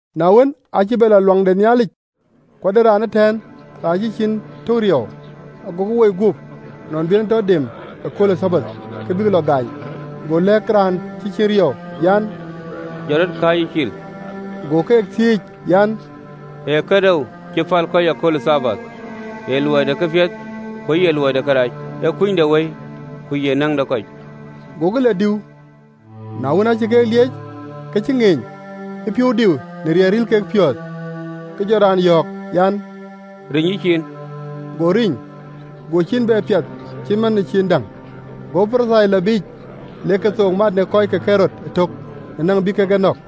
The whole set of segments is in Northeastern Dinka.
Na wën, aacï bɛ lɔ ɣön ë Nhialic, ku ade raan ëtɛ̈ɛ̈n raan cï ciin tök riɔu. Agokï woi guöp, nɔn bï en e tɔ dem ëkööl ë Thabath, ke bïk lɔ gaany. Go lɛ̈k raan cï ciin riɔu an, “Jɔt rɔt, kääcë cil.” Go keek thiëëc an, “Ee kënou cï päl kɔc ë kööl ë Thabath, ee luɔi de këpiɛth, ku ye luɔi de kërac? Ee kunydewëi, ku ye näŋ de kɔc?” Gokï lɔ diu. Na wën, aacï keek lieec ke cï ŋeeny, ë piɔ̈u diu në riɛl ril kek piɔ̈ɔ̈th, ke jɔ raan yɔ̈ɔ̈k an, “Riny yïciin.” Go riny: go ciin bɛ piath cït man ë ciin däŋ. Go Parithai lɔ biic, lek kethook mat në kɔc ke Ɣerod ëtök, në näŋ bï kek Yecu nɔ̈k.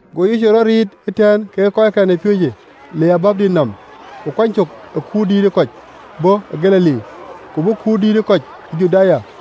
Go Yecu rɔt riic ëtɛ̈ɛ̈n kekë kɔckɛn ë piööcë le ë Baar ë Galili yɔu: ku kuany cök ë kut dïït ë kɔc bɔ̈ Galili: ku bɔ̈ kut dïït ë kɔc ë Juda,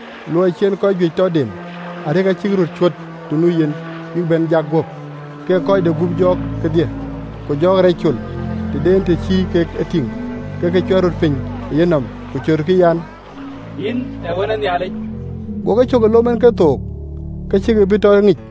luɔi cï en kɔc juëc tɔ dem, arëk acïk röt cuöt të nu yen, bïk bɛ̈n jak guöp, kek kɔc de gup jɔɔk kedhie. Ku jɔɔk rac col, të de en të cï kek e tïŋ, ke ke cuɛt röt piny ë yenɔm, ku cötkï an, “Yïn ee Wën ë Nhialic!” Go ke cök ë lom en kethook, ke cïkï bï tɔ ŋic.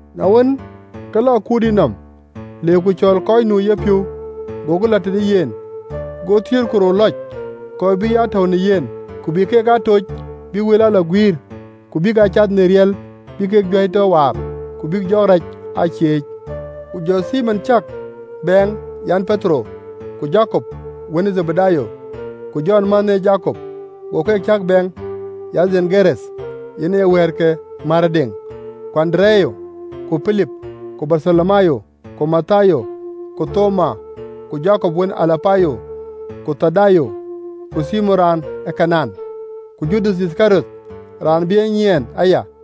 Na wën, ke lɔ ë kuurdït nɔm, le ku cɔɔl kɔc nu ë yepiɔ̈u: gokï lɔ tëde yen. Go thiëër ku rou lɔc, kɔc bï ya tɔ̈u në yen, ku bï keek aa tooc bïk wël aa lɔ guiir, ku bïk aa cath në riɛl bï kek juäi tɔ waar, ku bïk jɔɔk rac aa cieec: Ku jɔ Thimon cäk bɛɛŋ an, (Petero), ku Jakop wën ë Dhebedayo, ku Jɔn mänhë ë Jakop, go keek cäk bɛɛŋ, an, (Bowanek, yen aye “Wɛ̈ɛ̈t ke määrëdeŋ”), ku Andereya, ku Pilip, ku Bartholomayo, ku Mathayo, ku Thoma, ku Jakop wën ë Alapayo, ku Thadayo, ku Thimon raan ë Kanaan, ku Judath Yithkariɔt, raan bï e nyiɛɛn aya.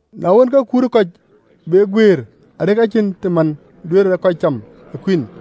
Na wën, ke kut ë kɔc be guëër, arëk acïn të man duëërë kɔc cam ë kuïn.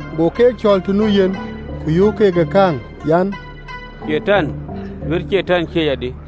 Go keek cɔɔl të nu yen, ku yöök keek ë kääŋ an, “Catan duëër Catan cieec adï?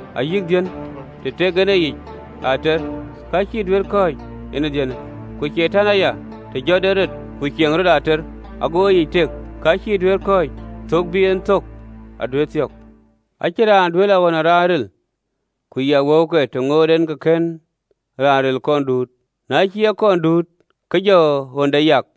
Ayï dhiën, të tek en eyic ater, ka cïï duëër kɔ̈ɔ̈c en ee dhiënë. Ku Catan aya, të jɔt en rɔt ku ciëk rɔt ater, ago eyic tek, ka cïï duëër kɔ̈ɔ̈c, thök bï en thök aduëër thiɔ̈k. “Acïn raan duëër lɔ ɣön ë raan ril, ku yiɛk wëuke, të ŋoot en ke kën raan ril kɔn duut, na cï en kɔn duut, ke jɔ ɣönde yak.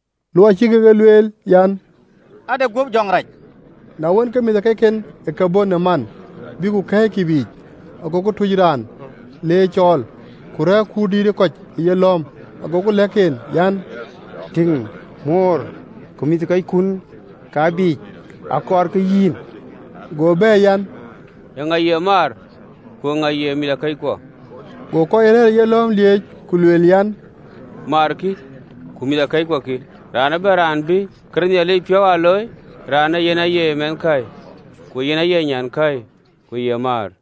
luɔi cï kek e lueel an, “Ade guöp jɔŋ rac.” Na wën, ke mïthëkɔcken ë ke bɔ̈ në man, bïk ku kɛ̈ɛ̈ckï biic, agokï tuöc raan, le ye cɔɔl. Ku rɛ̈ɛ̈r kut dïït ë kɔc ë yelɔ̈ɔ̈m, agokï lɛ̈k en an, “Tïŋ, moor ku mïthëkɔckun ka, biic, akɔɔrkï yïn.” Go bɛ̈ɛ̈r an, “Eeŋa ee maar? Ku ee yïŋa ee mïthëkɔckuɔ?” Go kɔc rɛ̈ɛ̈r ë yelɔ̈ɔ̈m lieec, ku lueel an, “Maar, kï, ku mïthëkɔckuɔ kï! Raan ëbɛ̈n raan bï këde Nhialic piɔ̈u aa looi, raanë yen aye Mɛnhkäi, ku ye nyankäi, ku ye maar.”